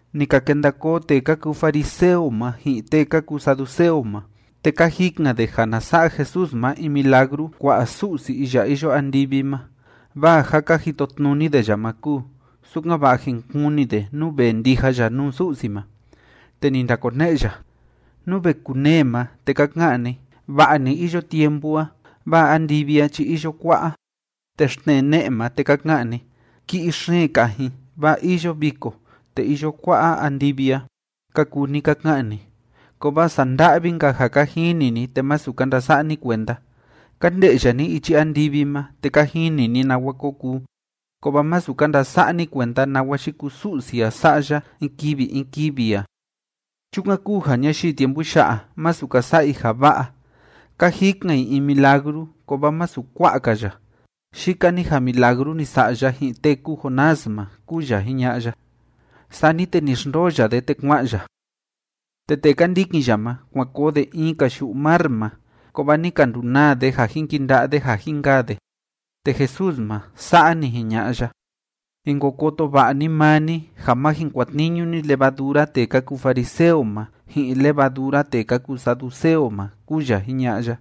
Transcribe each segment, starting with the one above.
Ni ka kenda koo tee ka kuu fariseo ma ji'in tee ka kuu saduceo ma, te ka jikan de ja na sa'a Jesús ma in milagru kua'a Su'si iya iyo andivi ma, vaa ja ka jitotnuni de ya ma kúu, sukan‑va'a jin kuni de nú vee ndija ya nuu Su'si ma. Te ni ndakone'e ya: ―Nú ve kunee ma, te ka ka'an ni: “Va'a‑ni iyo tiempu a, vaa andivi a chi iyo kua'a.” Te xtnee ma, te ka ka'an ni: “Ki'i xeen kajin, vaa iyo viko, te iyo kua'a andivi a”, ka kuu ni ka ka'an ni. ¡Kovaa sanda'vi‑nka ja ka jini ni te masu ka ndasa'a ni kuenda! Ka nde'ya ni ichi andivi ma, te ka jini ni nawa ko kuu, kovaa masu ka ndasa'a ni kuenda nawa yikuu Su'si a sa'a ya in kivi in kivi a. Chukan kúu ja ñayii tiempu ya'a, masu ka sa'a i ja va'a. Ka jikan i in milagru, kovaa masu kua'a‑ka ya, yika‑ni ja milagru ni sa'a ya ji'in tee kúu Jonás ma ―kúu ya jiña'a ya. Sani te ni xndoo ya de, te kua'an ya. Te tee ka ndikin ya ma, kuan koo de in‑ka yu'u mar ma, kovaa ni ka ndunaa de ja jin kinda'a de ja jin kaa de. Te Jesús ma, sa'a ni jiña'a ya: ―Jin ko koto va'a ni maa ni, ja ma jin kuatniñu ni levadura tee ka kuu fariseo ma ji'in levadura tee ka kuu saduceo ma ―kúu ya jiña'a ya.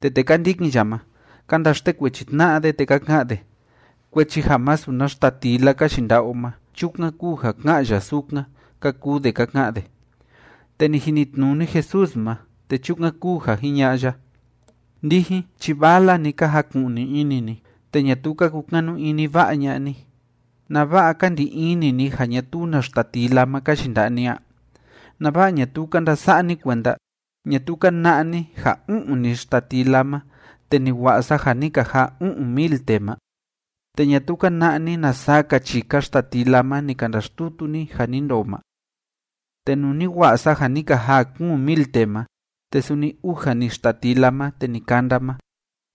Te tee ka ndikin ya ma, ka ndaxtekuechi tna'a de, te ka ka'an de: ―Kuechi ja masu na xtatila ka yinda'a o ma, chukan kúu ja ká'an ya sukan ―ka kuu de ka ka'an de. Te ni jinitnuni Jesús ma, te chukan kúu ja jiña'a ya: ―Ndijin chi vala‑ni ka jaku'ni ini ni, te ñatuu ka kukanu ini va'a ña'a ni. ¿Nava'a ka ndi ini ni ja ñatuu na xtatila ma ka yinda'a ni a? ¿Nava'a ñatuu ka ndasa'a ni kuenda? ¿Ñatuu ka na'a ni ja u'un‑ni xtatila ma, te ni wa'a sa ja ni ka jaa u'un mil tee ma? ¿Te ñatuu ka na'a ni na saa‑ka chika xtatila ma ni ka ndaxtutu ni ja ni ndoo ma? Te nuu ni wa'a sa ja ni ka jaa kuun mil tee ma, te suni uja‑ni xtatila ma te ni kanda ma,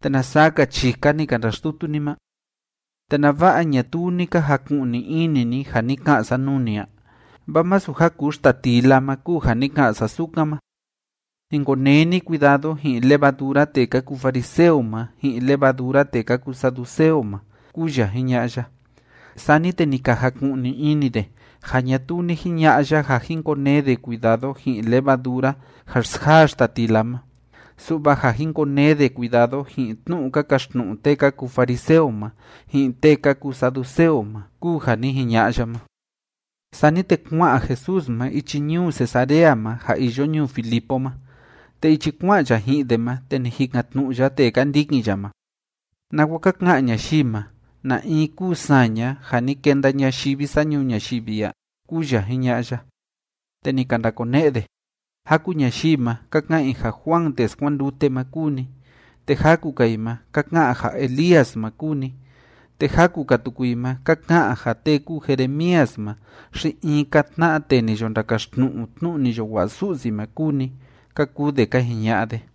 te ¿na saa‑ka chika ni ka ndaxtutu ni ma? ¿Te nava'a ñatuu ni ka jaku'ni ini ni ja ni ka'an sa nuu ni a? Vaa masu ja kuu xtatila ma kúu ja ni ka'an sa sukan ma. Jin konee ni cuidado ji'in levadura tee ka kuu fariseo ma ji'in levadura tee ka kuu saduceo ma ―kúu ya jiña'a ya. Sani te ni ka jaku'ni ini de ja ñatuu ni jiña'a ya ja jin konee de cuidado ji'in levadura ja xsjaa xtatila ma, su'va ja jin konee de cuidado ji'in tnu'u ka kaxtnu'u tee ka kuu fariseo ma ji'in tee ka kuu saduceo ma kúu ja ni jiña'a ya ma. Sani te kua'an Jesús ma ichi ñuu Cesarea ma ja iyo ñuu Filipo ma, te ichi kua'an ya ji'in de ma, te ni jikan‑tnu'u ya tee ka ndikin ya ma: ―¿Nawa ka ka'an ñayii ma, na in kúu saña, ja ni kenda ñayivi sa ñuu ñayivi a? ―kúu ya jiña'a ya. Te ni ka ndakone'e de: ―Jaku ñayii ma, ka ka'an i ja Juan tee skuandute ma kúu ni, te jaku‑ka i ma ka ka'an ja Elías ma kúu ni, te jaku‑ka tuku i ma ka ka'an ja tee kúu Jeremías ma xi in‑ka tna'a tee ni yo ndakaxtnu'u tnu'u ni yo wa'a Su'si ma kúu ni ―ka kuu de ka jiña'a de.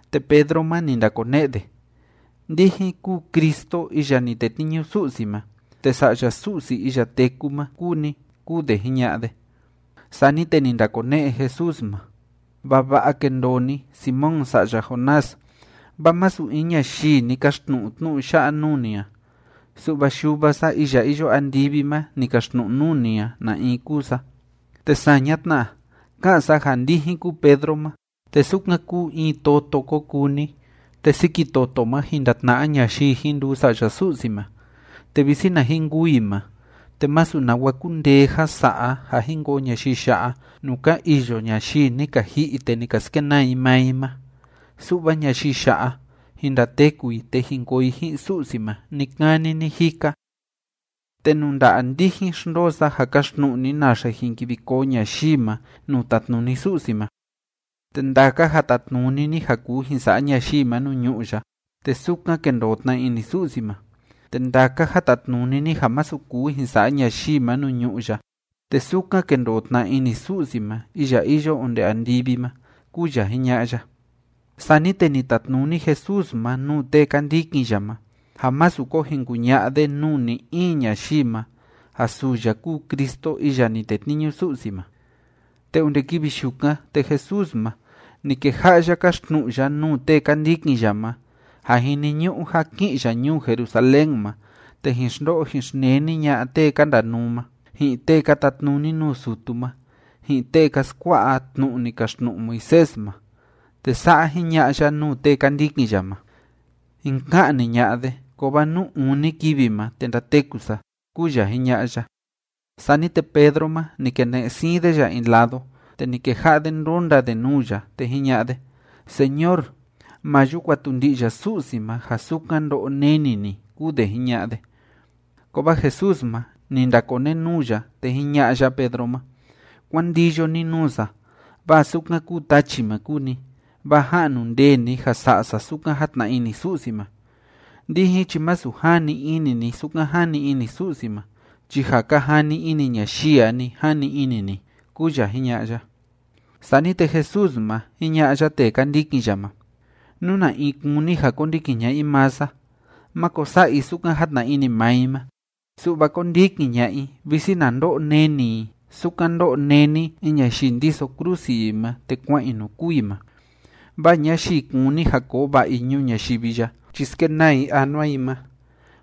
Te Pedro ma, ni ndakone'e de: ―Ndijin kúu Cristo iya ni tetniñu Su'si ma, te Sa'ya Su'si iya téku ma kúu ni ―kúu de jiña'a de. Sani te ni ndakone'e Jesús ma: ―Vava'a kendoo ni, Simón sa'ya Jonás, vaa masu in ñayii ni kaxtnu'u tnu'u ya'a nuu ni a, su'va Yuva sa iya iyo andivi ma ni kaxtnu'u nuu ni a na in kúu sa. Te saña tna, ká'an sa ja ndijin kúu Pedro ma, te sukan kúu in toto ko kuu ni, te siki toto ma jin ndatna'a ñayii jin nduu sa'ya Su'si ma, te visi na jin kûu i ma, te masu nawa kundee ja sa'a ja jin koo ñayii ya'a nuu ka iyo ñayii ni ka ji'i te ni ka skenaa i maa i ma, su'va ñayii ya'a, jin ndateku i te jin koo i ji'in Su'si ma ni‑kani ni‑jika. Te nuu nda'a ndijin xndoo sa ja kaxtnu'u ni naxe jin kivi koo ñayii ma nuu tatnuni Su'si ma. Te ndaka ja tatnuni ni ja kuu jin sa'a ñayii ma nuu ñu'ú ya, te sukan kendoo tna ini Su'si ma, te ndaka ja tatnuni ni ja masu kuu jin sa'a ñayii ma nuu ñu'ú ya, te sukan kendoo tna ini Su'si ma iya iyo onde andivi ma ―kúu ya jiña'a ya. Sani te ni tatnuni Jesús ma nuu tee ka ndikin ya ma ja másu ko jin kuña'a de nuu ni‑in ñayii ma ja suu ya kúu Cristo iya ni tetniñu Su'si ma. Te onde kivi yukan, te Jesús ma, ni keja'a ya káxtnu'u ya nuu tee ka ndikin ya ma ja jiniñu'u ja ki'in ya ñuu Jerusalén ma, te jin xndo'o jin xneni ña'a tee ka ndanuu ma, ji'in tee ka tatnuni nuu sutu ma, ji'in tee ka skua'a tnu'u ni kaxtnu'u Moisés ma. Te sa'a jiña'a ya nuu tee ka ndikin ya ma: ―Jin ka'ni ña'a de, kovaa nuu uni kivi ma, te ndateku sa ―kúu ya jiña'a ya. Sani te Pedro ma, ni kene'e siin de ya in lado, te ni keja'a de ndónda de nuu ya, te jiña'a de: ―Señor, ¡ma yuu kuatundi'ya Su'si ma ja sukan ndo'o neni ni! ―kúu de jiña'a de. Kovaa Jesús ma, ni ndakonenuu ya, te jiña'a ya Pedro ma: ―¡Kuán ndiyo ni nuu sa, vaa sukan kúu tachi ma kúu ni! Vaa ja'nu ndee ni ja sa'a sa sukan játna ini Su'si ma. Ndijin chi masu jani ini ni sukan jani ini Su'si ma chi ja ka jani ini ñayii a‑ni jani ini ni ―kúu ya jiña'a ya. Sani te Jesús ma, jiña'a ya tee ka ndikin ya ma: ―Nú na in kúni ja kondikin ña'a i maa sa, máko sa'a i sukan játna ini maa i ma, su'va kóndikin ña'a i, visi na ndo'o neni i sukan ndó'o néni in ñayii ndiso krusi i ma te kua'an i nuu kûu i ma. Vaa ñayii kúni ja koo va'a i ñuu ñayivi ya chi skenaa i anua i ma.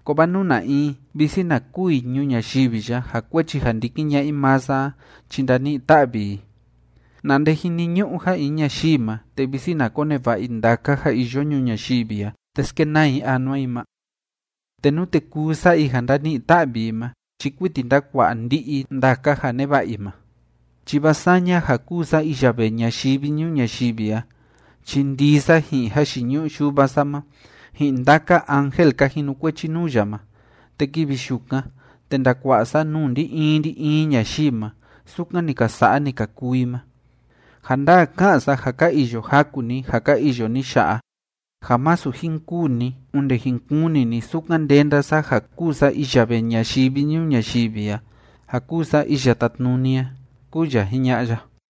Kovaa nú na in visi na kûu i ñuu ñayivi ya ja kuechi ja ndikin ña'a i maa sa a chi ndani'i‑ta'vi i. ¿Na nde jiniñu'u ja in ñayii ma, te visi na koneva'a i ndaka ja iyo ñuu ñayivi a te skenaa i anua i ma? Te nute kuu sa'a i ja ndani'i‑ta'vi i ma chi kuiti ndakua'a ndi'i i ndaka ja neva'a i ma. Chi vaa saña ja kúu sa iya vee ñayivi ñuu ñayivi a chi ndii sa ji'in jayiñu'u Yuva sa ma, ji'in ndaka ángel ka jinukuechi nuu ya ma, te kivi yukan, te ndakua'a sa nuu ndi‑in ndi‑in ñayii ma sukan ni ka sa'a ni ka kuu i ma. Ja ndaa ká'an sa ja ka iyo jaku ni ja ka iyo ni ya'a ja masu jin kûu ni onde jin kuni ni sukan ndenda sa ja kúu sa iya vee ñayivi ñuu ñayivi a ja kúu sa iya tátnuni a ―kúu ya jiña'a ya.